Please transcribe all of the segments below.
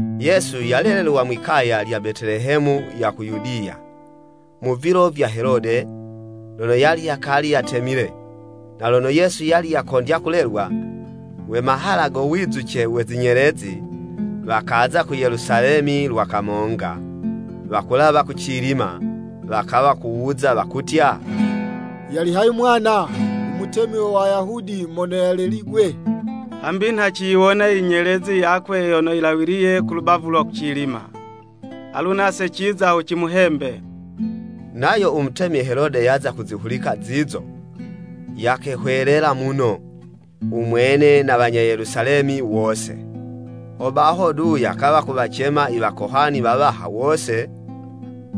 Yesu yalelelwa mwi'kaya lya Betelehemu ya ku Yudiya, mu vilo vya Helode, lono yali yakali yatemile. Na lono Yesu yali yakondya kulelwa, we mahala go wizuce we zinyelezi, wakaza ku Yelusalemi lwa kamonga, wakulawa kucilima, wakawa kuwuza wakutya, “Yali hayi mwana, u Mutemi we Wayahudi mono yaleligwe? Hambi nha ciyiwona i nyelezi yakwe lono yilawiye kulubavu lwa kucilima, alu nase ciza ho cimuhembe.” Nayo u mutemi Helode yaza kuzihulika zizo, yakehwelela muno, u mwene na wanya Yelusalemi wose. Hobaho du yakawa kuwacema i wakohani wawaha wose,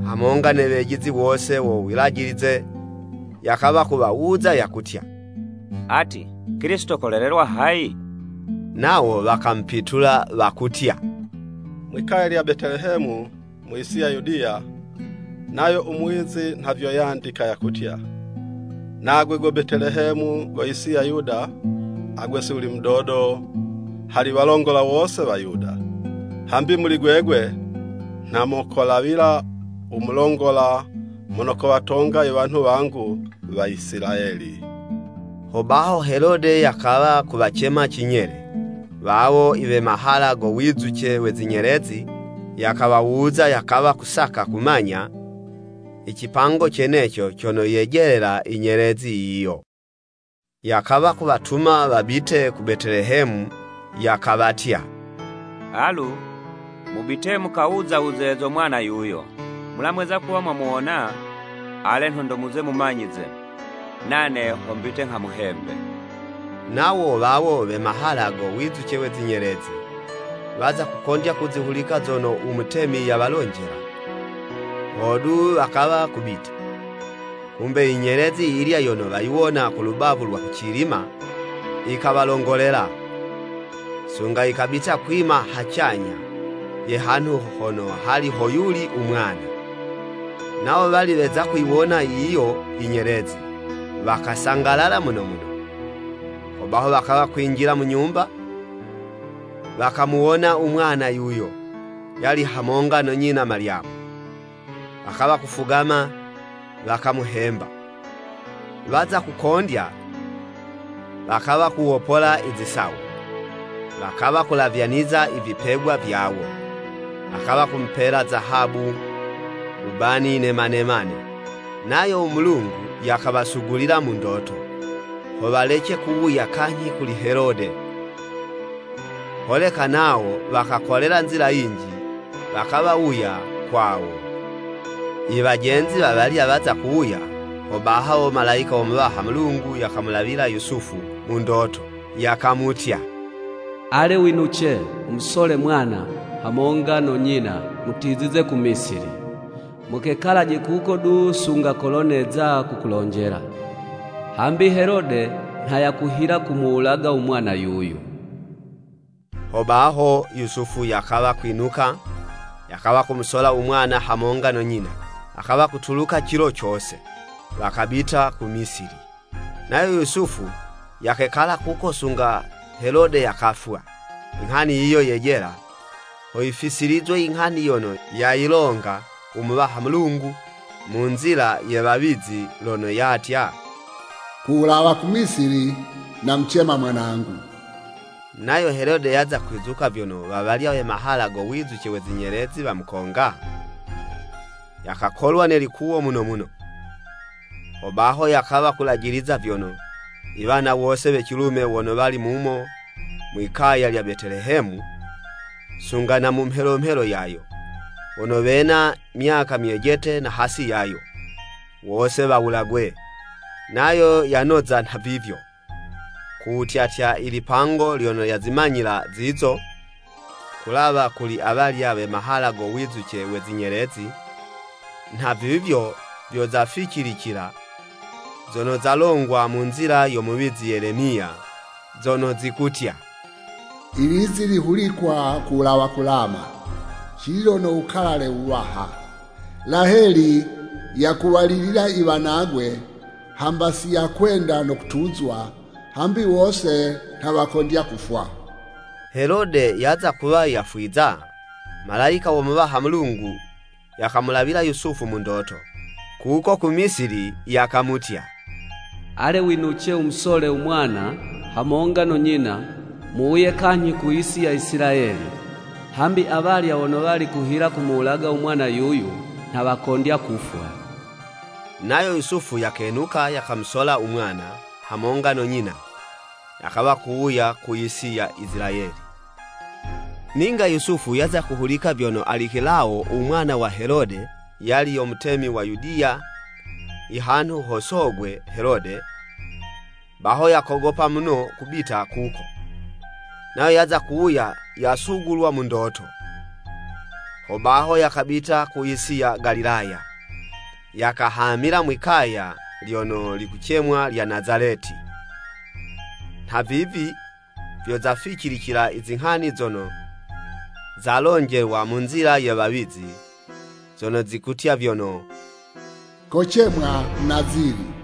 hamonga ne wejizi wose wo Wulajilize, yakawa kuwawuza yakutya, “Ati, Kilisito kolelelwa hayi?” Nawo wakamupitula wakutya, “Mwi'kaya lya Betelehemu mu yisi ya Yudiya. Nayo u muwizi nha vyo yandika, yakutya, ‘Nagwe go Betelehemu go yisi ya Yuda, agwe si wuli mudodo hali walongola wose wa Yuda, Hambi muli gwegwe, nha mokolawila u mulongola mono kowatonga iwanhu wangu waisilayeli.'" Hobaho Helode yakawa kuwacema cinyele, wawo i we mahala go wizuce we zinyelezi, yakawawuza yakawa kusaka kumanya icipango ceneco cono yejelela inyelezi yiyo. Yakawa kuwatuma wabite ku Betelehemu, yakawatya, “Alu, mubite mukawuza wuze zo mwana yuyo. Mulamweza kuwa mwamuwona, ale, nhondo muze mumanyize, nane ho mbite nghamuhembe.” Nawo wawo we mahala go wizuce we zinyelezi, waza kukondya kuzihulika zono u mutemi yawalonjela, hodu wakawa kubita. Kumbe inyelezi yiyilya yono wayiwona ku lubavu lwa kucilima, yikawalongolela, sunga yikabita kwima hacanyha ye hanhu hono hali hoyuli u mwana. Nawo wali weza kuyiwona yiyo i nyelezi, wakasangalala muno muno. Hobaho wakawa kwinjila mu nyumba, wakamuwona u mwana yuyo, yali hamonga no nyina Malyamu, wakawa kufugama, wakamuhemba. Waza kukondya, wakawa kuwopola izisawo, wakawa kulavyaniza ivipegwa vyawo, wakawa kumupela zahabu, wubani ne manemane. Nayo u Mulungu yakawasugulila mu ndoto, ho walece kuwuya kanyhi kuli Helode, holeka nawo wakakolela nzila yinji wakawuya kwawo. Iwajenzi wawalya waza kuwuka, hobaho Malayika wo Muwaha Mulungu yakamulawila Yusufu mu ndoto, yakamutya, “Ale, winuce! Wumusolaje mwana, hamonga no nyina, mutizize ku Misili. Mukekalaje kuko du sunga kolo neza kukulonjela, hambi Helode nha yakuhila kumuwulaga u mwana yuyu.” Hobaho, Yusufu yakawa kwinuka, yakawa kumusola u mwana hamonga no nyina, wakawa kutuluka cilo cose, wakabita ku Misili. Nayo Yusufu, yakekala kuko sunga Helode yakafwa. Inghani yiyo yejela, ho yifisilizwe inghani yono yayilonga u Muwaha Mulungu, mu nzila ye wawizi lono yatya, “Ku wulawa ku Misili, namucema Mwanangu.” Nayo Helode yaza kwizuka vyono wawalya we mahala go wizuce we zinyelezi wamukonga, yakakolwa ne likuwo muno muno. Hobaho yakawa kulajiliza vyono, iwana wose we cilume wono wali mumo mwi'kaya lya Betelehemu, sunga na mu mhelomhelo yayo, wono wena myaka myejete na hasi yayo, wose wawulagwe. Nayo yanoza nhavivyo, ku wutyatya ilipango lyono yazimanyila zizo ku wulawa kuli awalya we mahala go wizuce we zinyelezi. Nhavivyo vyo zaficilicila zono zalongwa mu nzila yo muwizi Yelemiya, zono zikutya, “Ilizi lihulikwa ku wulawa ku Lama, Cililo no wukalale wuwaha, Laheli yakuwalilila iwanagwe, hamba si yakwenda no kutuzwa, hambi wose nha wakondya kufwa.” Helode yaza kuwa yafwiza, Malayika wo Muwaha Mulungu yakamulawila Yusufu mu ndoto, kuko ku Misili, yakamutya, “Ale winuce! Wumusolaje u mwana, hamonga no nyina, muwuye kanyhi ku yisi ya Isilayeli, hambi awalya wono wali kuhila kumuwulaga u mwana yuyo nha wakondya kufwa.” Nayo Yusufu yakenuka, yakamusola u mwana hamonga no nyina, yakawa kuwuya ku yisi ya Isilayeli. Ninga Yusufu yaza kuhulika vyono Alikelawo u mwana wa Helode yali yo mutemi wa Yudiya ihanhu ho sogwe Helode, baho yakogopa muno ku wubita kuko. Nayo yaza kuwa yasugulilwa mu ndoto, hobaho yakabita ku yisi ya Galilaya, yakahamila mwi'kaya lyono likucemwa lya Nazaleti. Nhavivi vyo zaficilicila izinghani zono zalonjelwa mu nzila ye wawizi, zono zikutya vyono, “Kocemwa Munazili.”